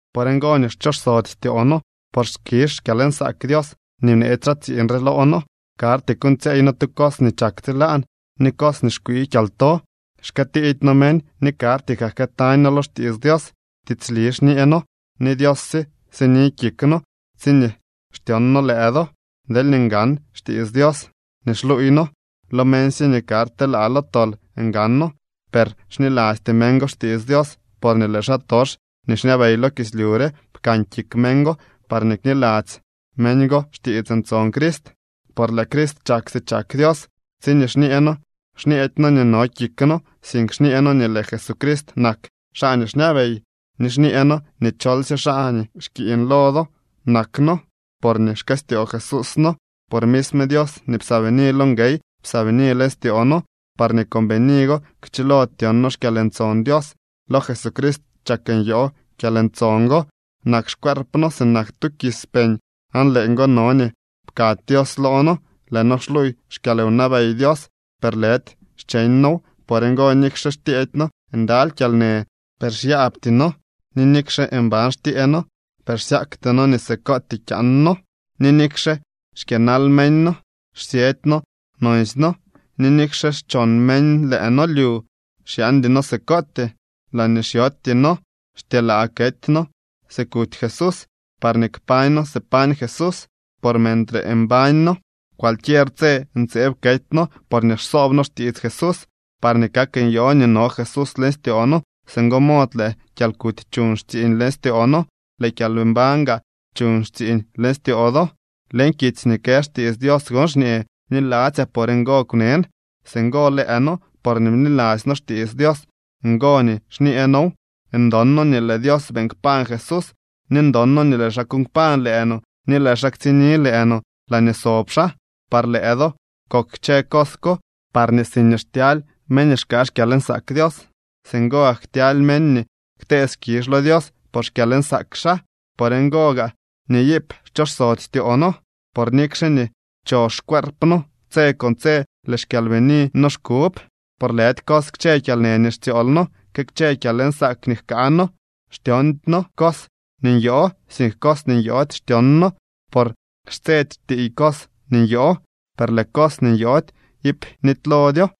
Por ngo nii xchosody styoo noo, por skizh xkyalnsaak Dios nii bneetsy xaa tsiiñ re loo noo. Karty kuuñtsyeey noo tu cos nii chak tsilaan ni cos nii xkwii kyalto. Xkëëtidy noo meñ ni karty kaa jkëëtañ noo lo xtiits Dios. Tiitslisy xñee noo ni Dios sye sini kik noo tsiñee xtyon noo lëë do. Deelñee ngan xtiits Dios nii xluuy noo, lo meñsye nii karty telaa lo tol ngano. Per xnilasty meñ go xtiits Dios porñee lëë xaatox nii xñabey lo kislyu re pkan kik meñ go parñee kniladzy meñ go xtiits ntson Crist, por lëë Crist chak si chak Dios. Tsiñee xñee noo, xñeedy noo nii no kik noo, sink xñee noo nii lëë Jesucrist nak xaa nii xñabey, ni xñee noo nii cholsye xaa nii xkiiñ lo do nak noo, porñee xkëstyoo Jesús noo. Por misme Dios nii psaabini lo nguey psaabini leñ styoo noo, parñee con bini go kchilo tyon noo xkyalntson Dios. Lo Jesucrist chak nyoo kyalntson go. Nak xcuerp noo sinak tu kis peñ aan leeñgo no nii pkaady Dios loo noo. Lëë noo xluuy xkyalwnabey Dios, per lëdy xcheñ noow. Por ngo, nikxe xtyeedy noo ndaly kyalnë, per xyaabty noo, ni nikxe mban xtyee noo, per xsyakty noo nii sikootyee kyaan noo. Ni nikxe xkyënal meñ noo, xsyëdy noo nonsy noo, ni nikxe xchon meñ lëë noo lyu, xyaandy noo sikootyee. Laañee xyootyee noo, xtyelaa kety noo si kuty Jesús, parñee kpañ noo si pañ Jesús. Por mentre mbañ noo, cualquier tse ntseeb kety noo porñee xsoob noo xtiits Jesús, parñee kak nyoo nii no Jesús leñ styoo noo. Singo mod lëë kyalkuty chuñ xtsiiñ leñ styoo noo, lëë kyalmbañ gaa chuñ xtsiiñ leñ styoo do. Leñ kitsy nii kë xtiits Dios gon xñee: “Bniladzyaa, por ngo kwnen.” Singo lëë noo porñee bniladzy noo xtiits Dios, ngo nii xñee noow. Ndon noo nii lëë Dios beeñ kpañ Jesús, ni ndon noo nii lëë xaa kuuñ kpañ lëë no ni lëë xaa tsikni lëë no laañee sob xaa. Par lëë do kok kchë cos ko, parñee siñee xtyaly meñ nii xkaa xkyalnsaak Dios, singo gak ktyaly meñ nii ktee skizh lo Dios por xkyalnsaak xaa. Por ngo gaa nii iip xchosody styoo noo. Por nikxe nii chox xcueerp noo, tse con tse lëë xkyalbinii noo xkub. Por lëdy cos kchë kyalnë nii xtsyool noo, que kchë kyalnsaak nii jkaa noo. Xtyoondy noo cos nii nyoo, sink cos nii nyoody xtyon noo. Por xtsedy xtiiy cos nii nyoo, per lëë cos nii nyoody iip nitylodyo.